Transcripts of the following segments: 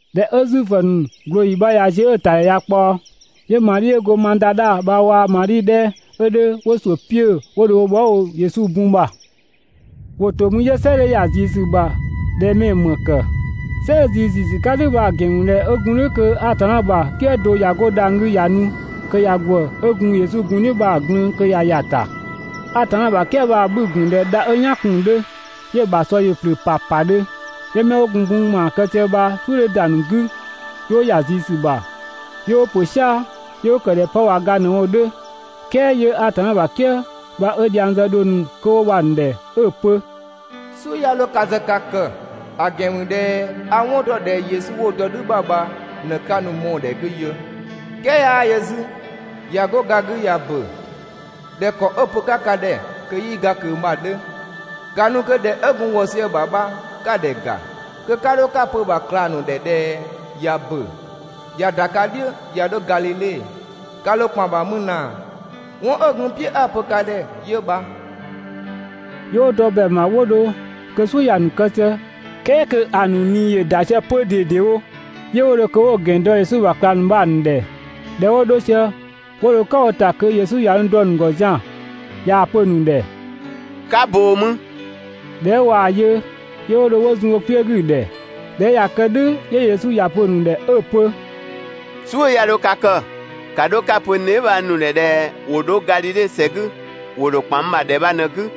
꞊Dhɛ 'ö Zuifö ‑nu ꞊glooyi bha ꞊ya ziö 'ö‑ ‑tadhɛ ꞊ya ꞊kpaɔ, 'yö Madhi 'ö go Madadha bha waa‑ Madhi 'dhɛ 'ö 'dhö 'wo ‑suʋ̈ 'piö‑ 'yö 'wo dho wo bhɔɔ" bho Yesu bun ‑bha. ‑Wo ‑to mü 'yö "sɛ 'dhö ‑ya ꞊zii ‑sü ‑bha ꞊dhɛ mɛ‑ ‑më ‑kë. "Sɛ 'ö ꞊zii ‑ziisü 'ka "dhʋ̈ bha‑ ‑gɛn ‑mü ꞊dhɛ 'ö gun "dhʋ̈ kö Atanna ‑bha "kië do ꞊ya 'go dhang‑ 'gü ꞊ya nu kö ꞊ya ‑gwë 'ö gun Yesu bun "dhiʋ̈ bha‑ bho 'mü kö ꞊yaa‑ glün‑ ꞊ya ‑ya ‑ta. Atanna ‑bha "kië bha‑ 'bhü‑ ‑gun ꞊dhɛ dha 'ö "yaan kun‑ 'dhö, 'yö‑ ‑bha ‑sɔ ‑yö ‑flʋ̈ ‑papadhö. 'Yö 'mɛ 'wo gun bun ‑maa kë sië bha "suʋ̈ 'dhö ‑da ‑nu 'gü, 'yö 'wo ‑ya ꞊zii ‑sü ‑bha 'yö 'wo ‑pö "sia‑ 'yö 'wo ‑kë ꞊dhɛ 'pë ꞊wa ga ꞊në‑ wo 'dhö. "Kɛɛ 'yö Atanna ‑bha "kië bha 'ö dhiang zë dhong ‑nu 'kö 'wo bha‑ ‑nu ‑dhɛ 'ö‑ pö: «"Suʋ̈ 'ya 'dho ka ‑zë ka kë, ‑a ‑gɛn ‑mü ꞊dhɛ a‑ 'wɔn ‑dɔ ꞊dhɛ Yesu 'wo‑ dɔ "dhü ‑bha bha ꞊në 'ka nu‑ mɔɔ‑ ‑dhɛ 'gü yö. "Kɛɛ 'yaa yö 'zü ꞊ya 'go ga 'gü ꞊ya ‑bö ꞊dhɛ ‑kɔ 'ö‑ pö‑ 'ka ka ‑dhɛ kö 'yii ga ꞊kö bha‑ 'dhö. ‑Ka nu kö ‑dhɛ 'ö gun wɔ sië‑ ‑bha bha 'ka‑ ‑dhɛ ‑ga, kö 'ka 'dho 'ka‑ pö‑ ‑bha ꞊klang ‑nu ‑dhɛ ꞊dhɛ ꞊ya ‑bö, ꞊ya ‑da ka "dhiʋ̈ ꞊ya 'dho Gadhidhe. Ka ‑dho ‑kpan ‑bha mü ꞊naa. 'Wɔn 'ö gun n "piʋ̈ 'a‑ pö ka ‑dhɛ 'yö bha.» 'Yö 'wo dɔ ‑bɛang ‑bha 'wo dho kö "suʋ̈ ‑ya ‑nu kë sië, "kɛɛ kö ‑a ‑nu ꞊nii ‑yö ‑da sië 'pö ꞊dedewo. 'Yö 'wo dho kö 'wo‑ ‑gɛn dɔ Yesu ‑bha ꞊klang ‑nu bha‑ ‑nu ‑dhɛ. ꞊Dhɛ 'wo 'dho sië 'wo dho "kan wo ‑ta kö Yesu ꞊ya nu dɔ‑ ‑nu ‑gɔ zian‑ ꞊yaa‑ pö‑ ‑nu ‑dhɛ: «'Ka ꞊boo mü!» ꞊Dhɛ 'ö ꞊waa‑ yö, 'yö 'wo dho 'wo zun wo kpiö 'gü‑ ‑dhɛ. ꞊Dhɛ 'ö ꞊ya kë "dhʋ̈, 'yö Yesu ‑ya pö‑ ‑nu ‑dhɛ 'ö‑ pö: «"Suʋ̈ 'ya 'dho ka kë, ‑ka 'dho 'ka‑ pö n dheebhang ‑nu ‑dhɛ ꞊dhɛ ‑wo 'dho Gadhidhe ‑sɛ 'gü, ‑wo ‑dho ‑kpan n ‑bha ‑dhɛ bha ꞊në‑ 'gü.»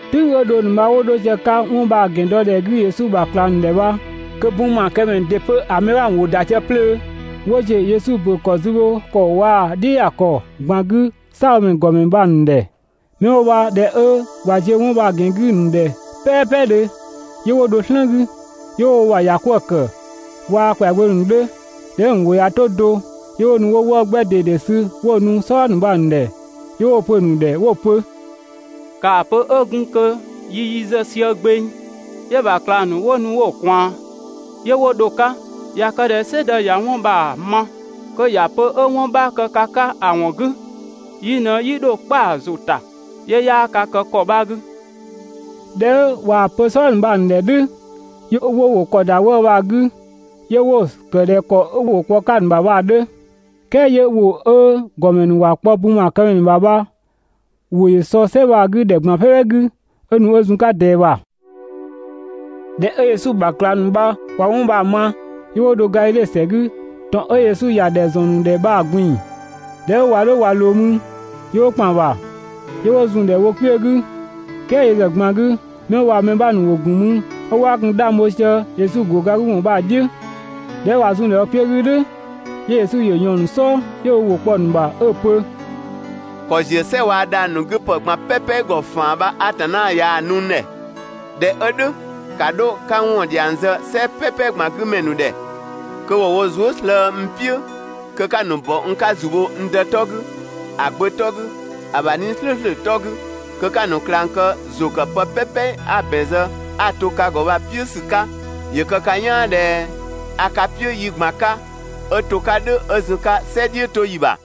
"Tʋ̈ng 'ö dhong ‑nu bha 'wo 'dho sië‑ 'ka 'wɔn bha‑ ‑gɛn dɔ ‑dhɛ 'gü Yesu ‑bha ꞊klang ‑nu ‑dhɛ bha, kö bun ‑maakëmɛ ‑nu ‑dɩ 'pö‑ mɛ 'bha ‑nu ‑wo ‑da sië 'plöö 'wo ‑ziö Yesu ‑bö ‑kɔ zü bho ‑kɔ waa‑ "dhiʋ̈ ‑ya ‑kɔ ꞊gban 'gü "saabhomɛ ‑nu ‑gɔmɛ ‑nu bha‑ ‑nu ‑dhɛ. 'Mɛ 'wo bha ꞊dhɛ 'ö ꞊wa ziö 'wɔn bha‑ ‑gɛn 'gü‑ ‑nu ‑dhɛ "pɛɛpɛdhö, 'yö 'wo dho "slën 'gü, 'yö 'wo wo ‑bha ‑ya 'kwëë‑ ‑kë waa‑ ‑kwɛagbö ‑nu 'dhö. ꞊Dhɛ 'ö‑ ‑nu ‑wʋ ꞊ya 'to do, 'yö 'wo nu 'wo 'wëë‑ 'gbɛ ꞊dede sü 'wo‑ nu "sɔdha ‑nu bha‑ ‑nu ‑dhɛ. 'Yö 'wo‑ pö‑ ‑nu ‑dhɛ 'wo‑ pö: «‑Kaa pö 'ö gun kö yi yi zë sië gbeng, 'yö‑ ‑bha ꞊klang ‑nu 'wo nu 'wo‑ ꞊kwaan, 'yö 'wo dho‑ 'ka.» ꞊Ya kë ꞊dhɛ "sɛdë ꞊ya 'wɔn bha‑ ma kö ‑ya pö 'ö 'wɔn 'bha kë ka 'ka ‑a ‑wɔn 'gü, yi ꞊në 'yi dho kpa‑ ‑zʋ ‑ta, 'yö 'yaa ka kë ‑kɔ 'bha 'gü. ꞊Dhɛ 'ö ꞊waa‑ pö "sɔdha ‑nu bha‑ ‑nu ‑dhɛ "dhʋ̈, 'yö 'wo wo ‑kɔ ‑da 'wëë‑ bha‑ 'gü, 'yö 'wo‑ ‑kë ꞊dhɛ ‑kɔ 'wo ‑wʋ kpɔ‑ 'ka‑ ‑nu ‑bha bha‑ 'dhö. "Kɛɛ 'yö ‑wʋ 'ö ‑gɔmɛ ‑nu ‑wa kpɔ bun ‑maakëmɛ ‑nu ‑bha bha‑ ‑wʋ ‑yö sɔ "sɛ bha‑ 'gü ‑dhɛ ꞊gban "pɛpɛ 'gü, 'ö nu 'ö zun‑ 'ka ꞊dɛɛ ‑bha. ꞊Dhɛ 'ö Yesu ‑bha ꞊klang ‑nu bha ꞊wa 'wɔn bha‑ ma, 'yö 'wo dho Gadhidhe ‑sɛ 'gü, ‑tɔn 'ö Yesu ‑ya ‑dhɛ ‑zɔn ‑nu ‑dhɛ bha‑ ꞊gbin‑. ꞊Dhɛ 'ö ꞊wa 'dho ꞊wa ꞊loo mü, 'yö 'wo ‑kpan ‑bha, 'yö 'wo zun‑ ‑dhɛ wo kpiö 'gü, "kɛɛ yö ‑zë ꞊gban 'gü, 'mɛ 'wo bha‑ mɛ 'bha ‑nu ‑gun mü 'ö 'waa gun 'dhang bho sië Yesu ‑go ga 'gü ‑wɔn bha‑ "dhiʋ̈. ꞊Dhɛ 'ö ꞊wa zun‑ ‑dhɛ kpiö 'gü "dhʋ̈, 'yö Yesu ‑yö ꞊yɔɔn‑ ‑nu "sɔɔ 'yö ö ‑wʋ kpɔ‑ ‑nu ‑bha 'ö‑ pö: «‑Kɔ ‑ziö "sɛ waa‑ dhang‑ ‑nu 'gü ‑pë ꞊gban "pɛpɛ ‑gɔ ‑faan bha Atanna ꞊yaa‑ nu n ‑dhɛ. ꞊Dhɛ 'ö "dhʋ̈ ‑ka 'dho 'ka n ‑wɔn ‑dhiang zë "sɛ "pɛpɛ ꞊gban 'gü mɛ ‑nu ‑dhɛ kö ‑wo wo zuë" slëë‑ n "piʋ̈ kö 'ka‑ ‑nu ‑bɔ n 'ka ‑zu bho n Dë 'tɔ 'gü, ‑a Gbö 'tɔ 'gü, ‑a ‑bha 'Nii‑ "slʋ̈ʋ̈slʋ̈ 'tɔ 'gü. Kö 'ka‑ ‑nu ꞊klang kë ‑zʋ ‑kë pë "pɛpɛ 'a‑ ‑bɛn zë 'a‑ to ka ‑gɔ bha‑ "piʋ̈ ‑sü 'ka. ‑Yö kë ka "yaan ꞊dhɛ a ka "piʋ̈ yi ꞊gban 'ka 'ö to‑ 'ka "dhʋ̈ 'ö zun‑ 'ka "sɛ "dhiʋ̈toyi ‑bha.»